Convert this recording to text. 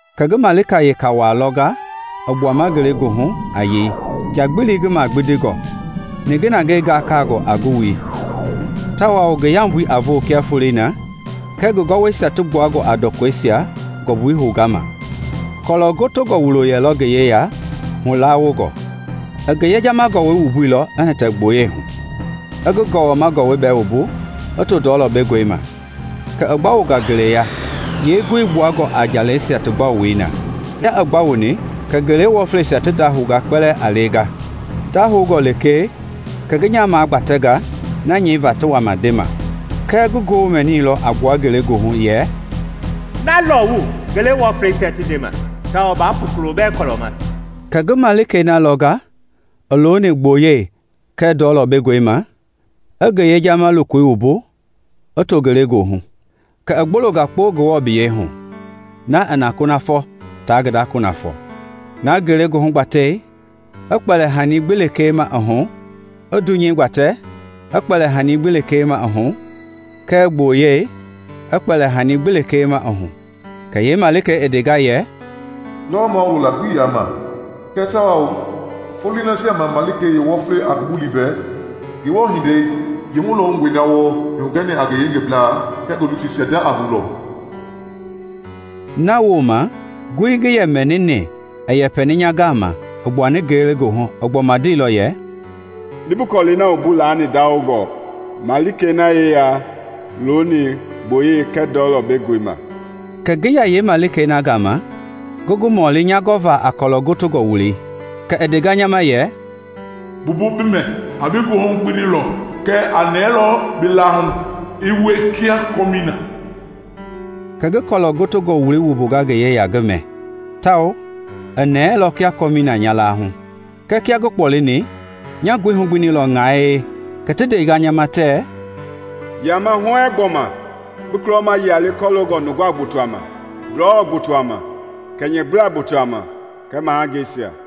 Kɛ ngi malika weka waa lɔnga i gbuama ngelegoohu a yei, njagbili ngi magbindingɔ, ninginangɛi gakaangɔ a ngi wui, tawao ngi yambui a voo kia foloi na kɛɛ ngi gɔwɔisia ti gbuangɔ a ndɔkɔisia ngɔmbui houga ma. Kɔlɔ gotongɔ wulo yɛlɔ ngi yeya hulawongɔ. I ngi yejama gɔwɔi wumbuilɔ i hitɛ gboyei hu, i ngi gɔwɔma gɔwɔi bɛɛ wumbu i too ndɔlɔ bengɔi ma, kɛ i gbaowonga ngeleya yeengoi kpuangɔ a njalɛisia ti gbaowoi na. Kia i gbawoni kɛ ngele wɔfleisia ti ndahounga kpɛlɛɛ a lenga. Ti ndahoungɔ lekee, kɛ ngi nya magbatɛnga na nyɛiva ti wama ndema. Kɛɛ ngoo ndeilɔ a gbua ngelegoohu yɛ, “Na lɔwu ngele wɔfleisia ti ndema, tawao baa pu kulobɛɛ kɔlɔ ma!” Kɛ ngi malikei na lɔnga i looni gboyei kɛɛ ndɔlɔ bengɔi ma i ngi yejama lokoi wumbu i too ngelegoohu, kɛ i gbolonga kpo Ngewɔ biyɛi hu, na i na kunafɔ ta ngi da kunafɔ, na ngelegoohu gbatei i kpɛli hani gbi lekee ma i hu, i dunyei gbatɛ i kpɛli hani gbi lekee ma i hu, kɛɛ gboyei i kpɛli hani gbi lekee ma i hu. Kɛ yeemalikei ndenga yɛ, “Lɔwɔ mawulo la gbii yaa ma! Kɛɛ tawao foloi nasia ma malikei yeewɔflei a ngi bulii vɛ, Ngewɔ hindei yeehulɔwungɔi na wɔɔ i hugɛni a ngi yengeblaa kɛɛ ngi lutuisia nda a houlɔ.” Nawooma ngooi ngi yɛ mɛnini i yɛpɛi nya gama a gbua ngelegoohu i gbɔma ndeilɔ yɛ, “Li bi kɔlɛi na wumbu laani ndawongɔ malikei na yeya looni gboyei kɛɛ ndɔlɔ bengɔi ma.” Kɛ ngi ya yeemalikei na gama ngi ngi mɔli nya gɔva a kɔlɔ gotongɔ wuloi. Kɛ i ndea nya ma yɛ, “Mbumbu bi mɛ; a bi goohu gbinilɔ, kɛɛ a nɛɛlɔ bi laahu i wie kia kɔmii na.” Kɛ ngi kɔlɔ gotongɔ wuloi wumbua ngi yeya ngi mɛ, tawao i nɛɛlɔ kia kɔmii na nya laahu. Kɛɛ kia ngi kpɔlini, nya goohu gbinilɔ ŋae. Kɛ ti ndea nya ma tɛ, “Yama huɛɛŋ gbɔma bi kulɔma yia le kɔloongɔ nunga gbotoa ma, ndɔlɔ gbotoa ma, kɛnyɛblaa gbotoa ma kɛɛ mahangeisia.”